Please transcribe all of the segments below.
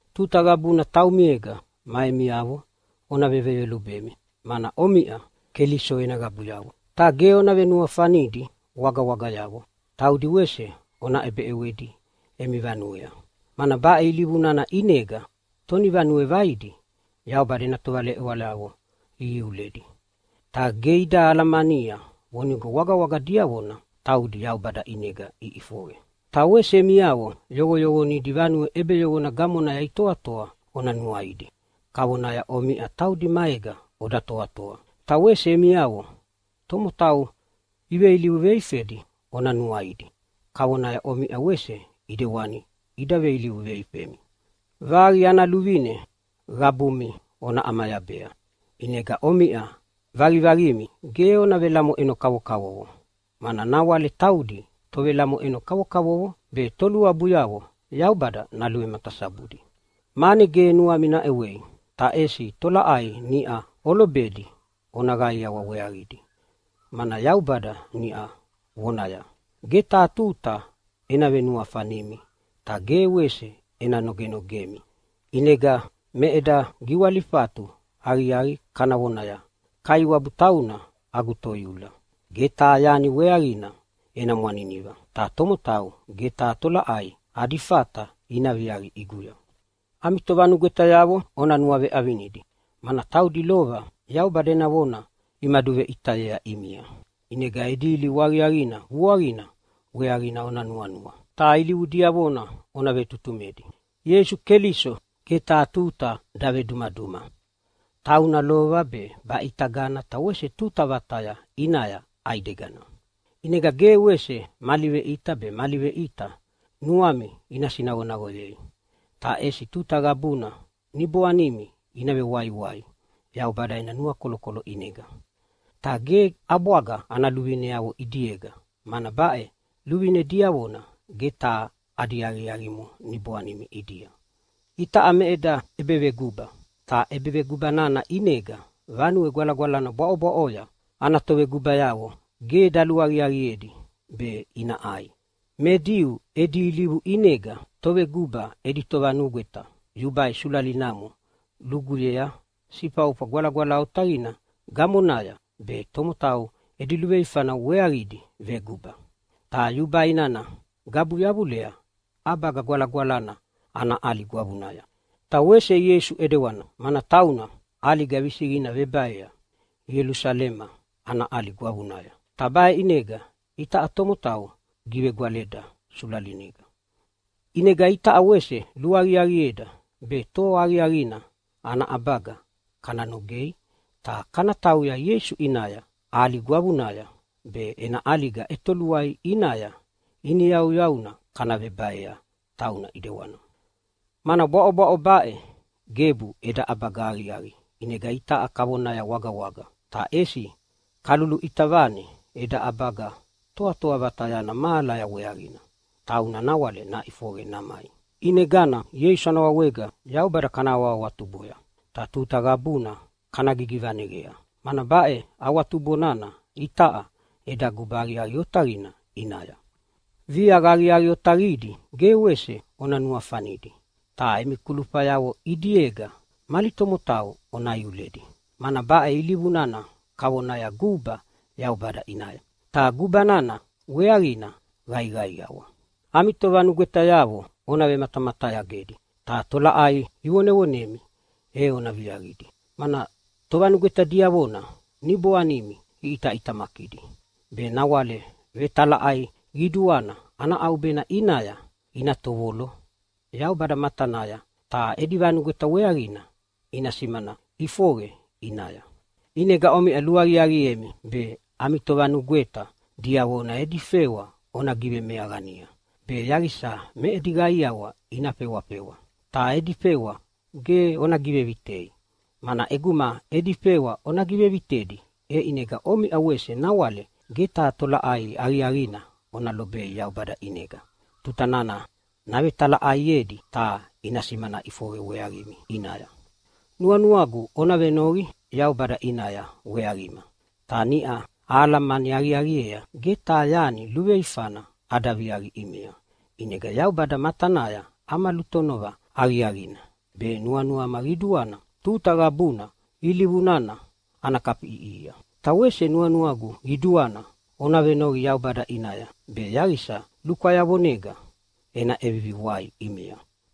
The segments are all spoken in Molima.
Tuta qabuna taumiega ma emiavo ona veveyolubemi, mana omiʼa Keliso ena qabuyavo. Ta ge ona venuafanidi wagawagayavo. Taudi wese ona ʼebeʼewedi emi vanuea, mana baʼe ilivu nana ʼinega tonivanue vaidi Yaubada ena tovaleʼewayavo ihiuledi, ta ge ida alamania vonigo wagawaga diavona taudi Yaubada ʼinega iʼifoqe. Ta wese emiavo yoqoyoqonidi vanue ʼebeyoqona gamonaya itoatoa ona nuaidi kavonaya omiʼa taudi maega oda toatoa. Ta wese emiavo tomotau iveilivu veifedi ona nuaidi kavonaya omiʼa wese ʼidewani ida veilivu veifemi. Vaqi ana luvine qabumi ona ʼamayabea. ʼInega omiʼa vaqivaqimi ge ona velamoʼeno kavokavovo, mana nawale taudi tovelamoʼeno kavokavovo be toluabuyavo Yaubada naluvematasabudi. Mane ge nuami naʼewei, ta ʼesi tolaʼai niʼau olobedi ona qaiawa weaqidi, mana Yaubada niʼau vonaya, “Ge taha tuta ena venuafanimi ta ge wese ena nogenogemi.” ʼInegana me eda giwalifatu aqiaqi kana vonaya, “Kaiwabu tauna agu toiula! Ge taha yani weaqina ena mwaniniva. Ta tomotau ge taha tolaʼai adi fata ina viaqi ʼiguya.” Ami tovanugwetayavo ona nuaveʼavinidi, mana taudi lova Yaubada ena vona imaduveʼitayea ʼimia. ʼInega edi ilivu aqiaqina vuaqina weaqina ona nuanua, ta ilivu diavona ona vetutumedi. Ieisu Keliso ge taha tuta davedumaduma. Tauna lova be baʼitagana ta wese tuta vataya ʼinaya ʼaidegana. ʼInega ge wese mali veʼita be mali veʼita nuami ina sinaqonaqoyei. Ta ʼesi tuta qabuna niboanimi ina vewaiwai Yaubada ena nuakolokolo ʼinega, ta ge ʼabwaga ana luvineavo ʼidiega, mana baʼe luvine diavona ge taha adi aqiaqimo niboanimi ʼidia. Itaʼa me eda ʼebeveguba, ta ʼebeveguba nana ʼinega Vanue Gwalagwalana bwaʼobwaʼoya ana tovegubayavo ge daluaqiaqiedi be ina ʼai. Me Diu edi ilivu ʼinega toveguba edi tovanugweta yubai sulalinamo luguyea Sifaufa Gwalagwala Otaqina gamonaya be tomotau edi luveifana weaqidi veguba. Ta yubai nana gabu yavulea ʼabaga gwalagwalana ana ʼali gwavunaya. Ta wese Ieisu ʼidewana, mana tauna ʼaliga visiqina vebaea Ielusalema ana ʼali gwavunaya, ta baʼe ʼinega itaʼa tomotau givegwaleda sulalinega. ʼInega itaʼa wese luaqiaqieda be toa aqiaqina ana ʼabaga kana nogei ta kana tauya Ieisu ʼinaya ʼali gwavuya be ena ʼaliga ʼetoluai ʼinaya iniyauyauna kana vebaea tauna ʼidewana. Mana bwaʼobwaʼo baʼe gebu eda ʼabaga aqiaqi, ʼinega itaʼa kavonaya wagawaga. Ta ʼesi kaluluʼita vane eda ʼabaga toatoa vatayana mahalaya weaqina, tauna nawale naʼifoqe namai. ʼInegana Ieisu ana wawega Yaubada kana awahawatuboya, ta tuta qabuna kana gigivaneqea, mana baʼe awatubo nana itaʼa eda guba aqiaqi otaqina ʼinaya. Viaqa aqiaqi otaqidi ge wese ona nuafanidi, ta emi kulufayavo ʼidiega mali tomotau ona iuledi, mana baʼe ilivu nana kavona guba Yaubada ʼinaya, ta guba nana weaqina qaiqaiawa. Ami tovanugwetayavo ona vematamatayagedi, ta tolaʼai ivonevonemi e ona viaqidi, mana tovanugweta diavona niboanimi iʼitaʼitamakidi, be nawale vetalaʼai qiduana ana ʼaubena ʼinaya ina tovolo Yaubada matanaya ta edi vanugweta weaqina ina simana ʼifoqe ʼinaya. ʼInegana omiʼa luaqiaqiemi be ami tovanugweta diavona edi fewa ona givemeaqania be yaqisa me edi qaiawa ina fewafewa, ta edi fewa ge ona givevitei. Mana ʼeguma edi fewa ona givevitedi, e ʼinega omiʼa wese nawale ge taha tolaʼai aqiaqina ona lobei Yaubada ʼinega tuta nana navetalaʼaiedi ta ina simana ʼifoqe weaqimi ʼinaya. Nuanuagu ona venoqi Yaubada ʼinaya weaqima. Ta niʼa ahalamani aqiaqiea ge taha yani luveifana ada viaqi ʼimia, ʼinega Yaubada matanaya ama lutonova aqiaqina, be nuanuama qiduana tuta qabuna ilivu nana ana kafiʼiʼihia. Ta wese nuanuagu qiduana ona vevenoqi Yaubada ʼinaya be yaqisa lukwayavonega ena ʼevivi wai ʼimia.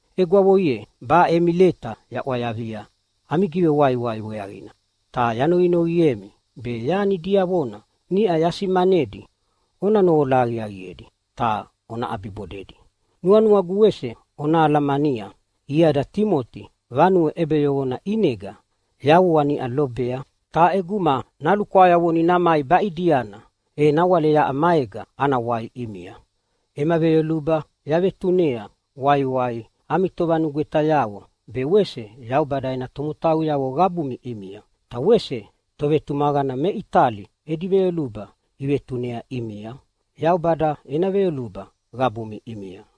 Egwavo ye, baʼe emi leta yaʼwayavia ami givewaiwai weaqina, ta yanoqinoqiemi be yani diavona niʼa yasimanedi ona noqola aqiaqiedi ta ona ʼabibodedi. Nuanuagu wese ona alamania iada Timoti vanue ʼebeyoqona ʼinega yavua niʼa lobea, ta ʼeguma nalukwayavoni namai baʼidiana, e nawale yaʼa maega ana wai ʼimia. Ema veyoluba yavetunea waiwai ami tovanugwetayavo be wese Yaubada ena tomotauyavo qabumi ʼimia. Ta wese tovetumaqana me Itali edi veyoluba ivetunea ʼimia. Yaubada ena veyoluba qabumi ʼimia.